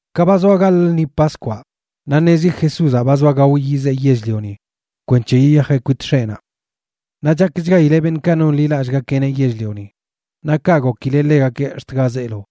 Ka ba zoa gaḻꞌ lṉi Paskwaꞌ, naꞌ ṉezi Jesúzaꞌ ba zoa gao yizee yell-lioni kwenc̱he yiyajeꞌ kwit X̱eꞌnaꞌ. Naꞌ chakchgaileꞌ beṉꞌkaꞌ nonḻilallꞌgakeꞌneꞌ yell-lioni, naꞌ kaꞌ gokileꞌ ḻegakeꞌ ax̱t ga zeelo.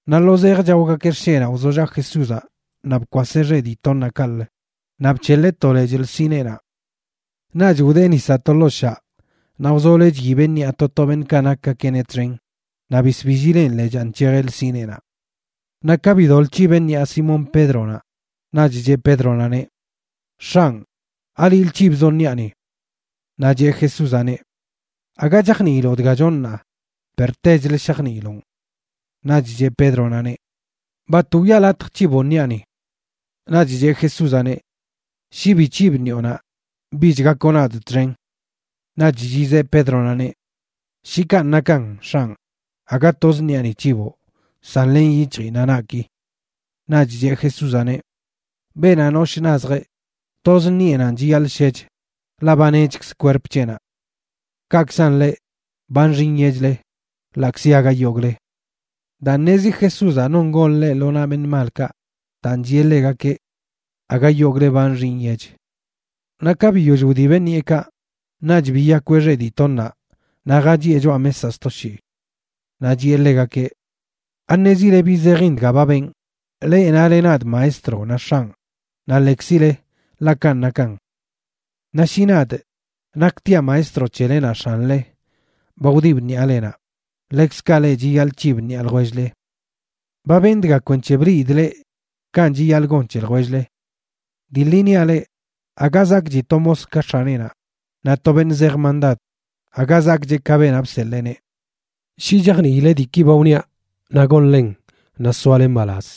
Naꞌ lo zej chaogakeꞌ xsheꞌnaꞌ, wzollaꞌ Jesúzaꞌ naꞌ bkwaseꞌ xeꞌ dii toṉaꞌ kaꞌlə, naꞌ bc̱heḻeꞌ to lechꞌ lsineenaꞌ. Naꞌch wdee nisaꞌ to ḻoo shaꞌ naꞌ wzoloeꞌ chyibeꞌ ṉiꞌa to to beṉꞌkaꞌ nakgakeꞌneꞌ txen, naꞌ bisbillileꞌn lechaa nc̱hejeꞌ lsineenaꞌ. Naꞌ ka bidoḻꞌ c̱hibeꞌ ṉiꞌa Simón Pédronaꞌ, naꞌch cheꞌ Pédronaꞌneꞌ: ―X̱anꞌ, ¿aliꞌlə c̱hibzoꞌ ṉiꞌani? Naꞌ cheꞌ Jesúzaꞌneꞌ: ―Aga chajniiloꞌ dga chonꞌ ṉaa, per techlə shajniiloꞌn. Naꞌch cheꞌ Pédronaꞌneꞌ: ―Bat wiꞌa latj c̱hiboꞌ ṉiꞌani. Naꞌch cheꞌ Jesúzaꞌneꞌ: ―Shi bi c̱hibꞌ ṉiꞌonaꞌ, bich gakoꞌ nadꞌ txen. Naꞌch chizeꞌ Pédronaꞌneꞌ: ―Shi kanꞌ nakan, X̱anꞌ, aga toz ṉiꞌani c̱hiboꞌ san ḻen yic̱hji naꞌ naꞌki. Naꞌch cheꞌ Jesúzaꞌneꞌ: ―Beenaꞌ noshꞌ nazjeꞌ, toz ṉiꞌenanꞌ chiyaḻꞌ shech, ḻaꞌ ba nechkz kwerp c̱heꞌnaꞌ. Kaꞌkzan leꞌ, ba nxi nyechle, ḻaꞌkzi aga yogꞌle. Daa ṉezi Jesúzaꞌ non gon ḻeꞌ lo naꞌ beṉꞌ malkaꞌ, daan chiꞌe ḻegakeꞌ: “Aga yogꞌle ba nxi nyech.” Naꞌ ka biyoll wdibeꞌ ṉiꞌekaꞌ, naꞌch biyakweꞌ xeꞌ dii toṉaꞌ naꞌ jachiꞌe choꞌa mesaꞌ sto shii. Naꞌ chiꞌe ḻegakeꞌ: ―¿Aṉezile bi zejin dga ba benꞌ? Leꞌ nale nadꞌ Maestro naꞌ X̱anꞌ, naꞌ lekzile, ḻaꞌ kanꞌ nakan. Naꞌ shi nadꞌ, naktiaꞌ Maestro c̱hele naꞌ X̱anle, ba wdibꞌ ṉiꞌalenaꞌ, ḻekzkaꞌ leꞌ chiyaḻꞌ c̱hib ṉiꞌa ljwell-le. Ba benꞌ dga kwenc̱he bliidꞌ leꞌ kanꞌ chiyaḻꞌ gon c̱he ljwell-le. Dii ḻi niaꞌ leꞌ, aga zakꞌchi to mos ka x̱aneꞌnaꞌ, naꞌ to beṉꞌ zej mandad aga zakꞌcheꞌ ka beenaꞌ bseḻeeneꞌ. Shi chajniile diiki ba wniaꞌ naꞌ gonlen, naꞌ soale mbalaz.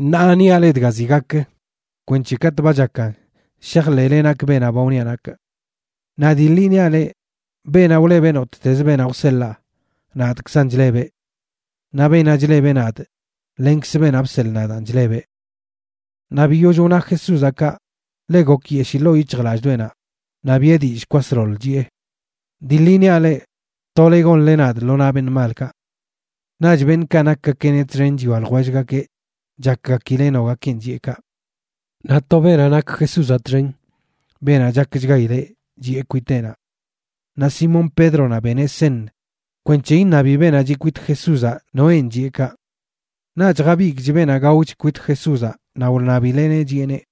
Ṉaa niaꞌ leꞌ dga ziꞌ gak, kwenc̱he katꞌ ba chakan shajḻeꞌle nakꞌ beenaꞌ ba wniaꞌ nakꞌ. Naꞌ dii ḻi niaꞌ leꞌ, beenaꞌ wlebeꞌ nottezə beenaꞌ wseḻaa, nadꞌkzan chlebeꞌ. Naꞌ beenaꞌ chlebeꞌ nadꞌ, lenkz beenaꞌ bseḻꞌ nadaan chlebeꞌ. Naꞌ biyoll wna Jesúzaꞌ kaꞌ, ḻe gokyeshii ḻoo yic̱hjlallꞌdoꞌenaꞌ, naꞌ biꞌe dillꞌ kwasḻoḻ, chiꞌe: ―Dii ḻi niaꞌ leꞌ, tole gonle nadꞌ lo naꞌ beṉꞌ malkaꞌ. Naꞌch beṉꞌkaꞌ nakgakeꞌneꞌ txen chwia ljwellgakeꞌ chakgakileꞌ nogakenꞌ chiꞌe kaꞌ. Naꞌ to beenaꞌ nak Jesúzaꞌ txen, beenaꞌ chakchgaileꞌ, chiꞌe kwiteꞌnaꞌ. Naꞌ Simón Pédronaꞌ beneꞌ seṉ kwenc̱he iṉabi beenaꞌ chiꞌ kwit Jesúzaꞌ noenꞌ chiꞌe kaꞌ. Naꞌch jabigꞌch beenaꞌ gaoch kwit Jesúzaꞌ naꞌ wṉabileꞌneꞌ, chiꞌeneꞌ: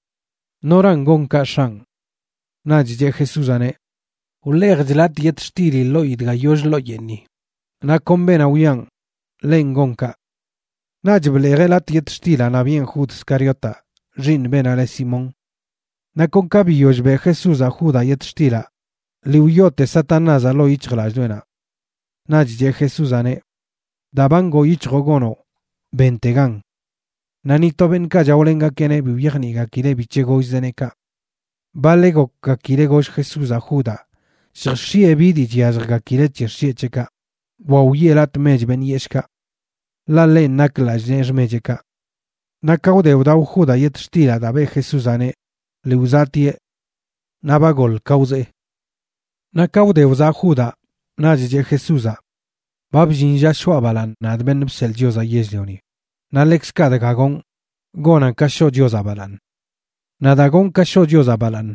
―¿Noran gon kaꞌ, X̱anꞌ? Naꞌch cheꞌ Jesúzaꞌneꞌ: ―Wḻeejchꞌ latꞌ yetxtili ḻoꞌi dga yoll ḻoo yeeṉi, naꞌ kon beenaꞌ wiꞌan, ḻenꞌ gon kaꞌ. Naꞌch bḻeejeꞌ latꞌ yetxtilaꞌ naꞌ biꞌen Jud Scariotaꞌ, xiiṉ beenaꞌ le Simón. Naꞌ kon ka biyoll beꞌ Jesúzaꞌ Judaꞌ yetxtilaꞌ, lii wyoote Satanázaꞌ ḻoo yic̱hjlallꞌdoꞌenaꞌ. Naꞌch cheꞌ Jesúzaꞌneꞌ: ―Daa ba ngoo yic̱hjoꞌ gonoꞌ, bentegan. Naꞌ ni to beṉꞌkaꞌ chaolengakeꞌneꞌ bi wyajniꞌgakileꞌ bic̱he gollzeꞌneꞌ kaꞌ. Baḻeꞌ gokgakileꞌ goll Jesúzaꞌ Judaꞌ lljx̱iꞌe bi dii chyalljgakileꞌ c̱he xsheꞌ c̱heꞌkaꞌ, wa wiꞌe latꞌ mech beṉꞌ yeshꞌkaꞌ. Ḻaꞌ ḻenꞌ nak lallꞌ nee xmecheꞌkaꞌ. Naꞌ ka wde wdao Judaꞌ yetxtilaꞌ daa beꞌ Jesúzaꞌneꞌ, lii wzaꞌtieꞌ. Naꞌ ba goḻ ka wzee. Naꞌ ka wde wzaꞌ Judaꞌ, naꞌch cheꞌ Jesúzaꞌ: ―Ba bllin lla shoꞌa balaaṉ, nadꞌ, Beṉꞌ Bseḻꞌ Chiozaꞌ Yell-lioni, naꞌ ḻekzkaꞌ dga gonꞌ, gonan ka shoꞌ Chiozaꞌ balaaṉ. Naꞌ daa gonꞌ ka shoꞌ Chiozaꞌ balaaṉ,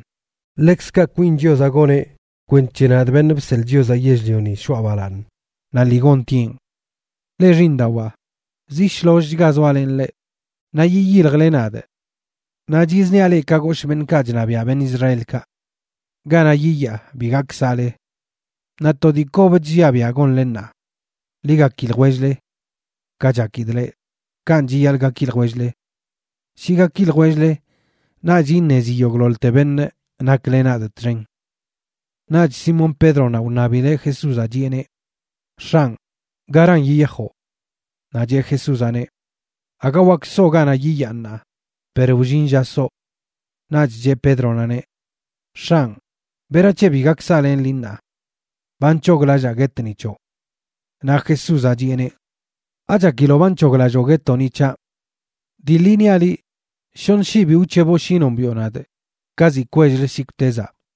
ḻekzkaꞌ kwin Chiozaꞌ goneꞌ kwenc̱he nadꞌ, Beṉꞌ Bseḻꞌ Chiozaꞌ Yell-lioni, shoꞌa balaaṉ, naꞌ lii gontieꞌn. Leꞌ xiiṉdawaa, zi shlollchga zoalenꞌ leꞌ. Naꞌ yiyiljle nadꞌ, naꞌ chizniaꞌ leꞌ ka goshꞌ beṉꞌkaꞌ chṉabiaꞌ beṉꞌ Israelkaꞌ: Ganaꞌ yiyaa, bi gak saꞌle. Naꞌ to dii kob chlliaꞌ biaꞌ gonle ṉaa: Ḻi gaki ljwell-le. Ka chakidꞌ leꞌ, kanꞌ chiyaḻꞌ gaki ljwell-le. Shi gaki ljwell-le, naꞌch iṉezi yogꞌḻoḻte beṉꞌ nakle nadꞌ txen. Naꞌch Simón Pédronaꞌ wṉabileꞌ Jesúzaꞌ, chiꞌeneꞌ: ―X̱anꞌ, ¿garan yiyajoꞌ? Naꞌ cheꞌ Jesúzaꞌneꞌ: ―Aga wak soo ganaꞌ yiyaa ṉaa, per wllin lla soo. Naꞌch cheꞌ Pédronaꞌneꞌ: ―X̱anꞌ, ¿berac̱he bi gak saꞌlenꞌ liꞌ ṉaa? Ba nc̱hoglallaa guetꞌ ni c̱hoꞌ. Naꞌ Jesúzaꞌ chiꞌeneꞌ: ―¿Achakiloꞌ ba nc̱hoglalloo guetoꞌ ni c̱haꞌ? Dii ḻi niaꞌ liꞌ, shoṉ shii bi wc̱heboꞌ shi nombiꞌo nadꞌ ka ziꞌ kwell-lə shikwtezaꞌ.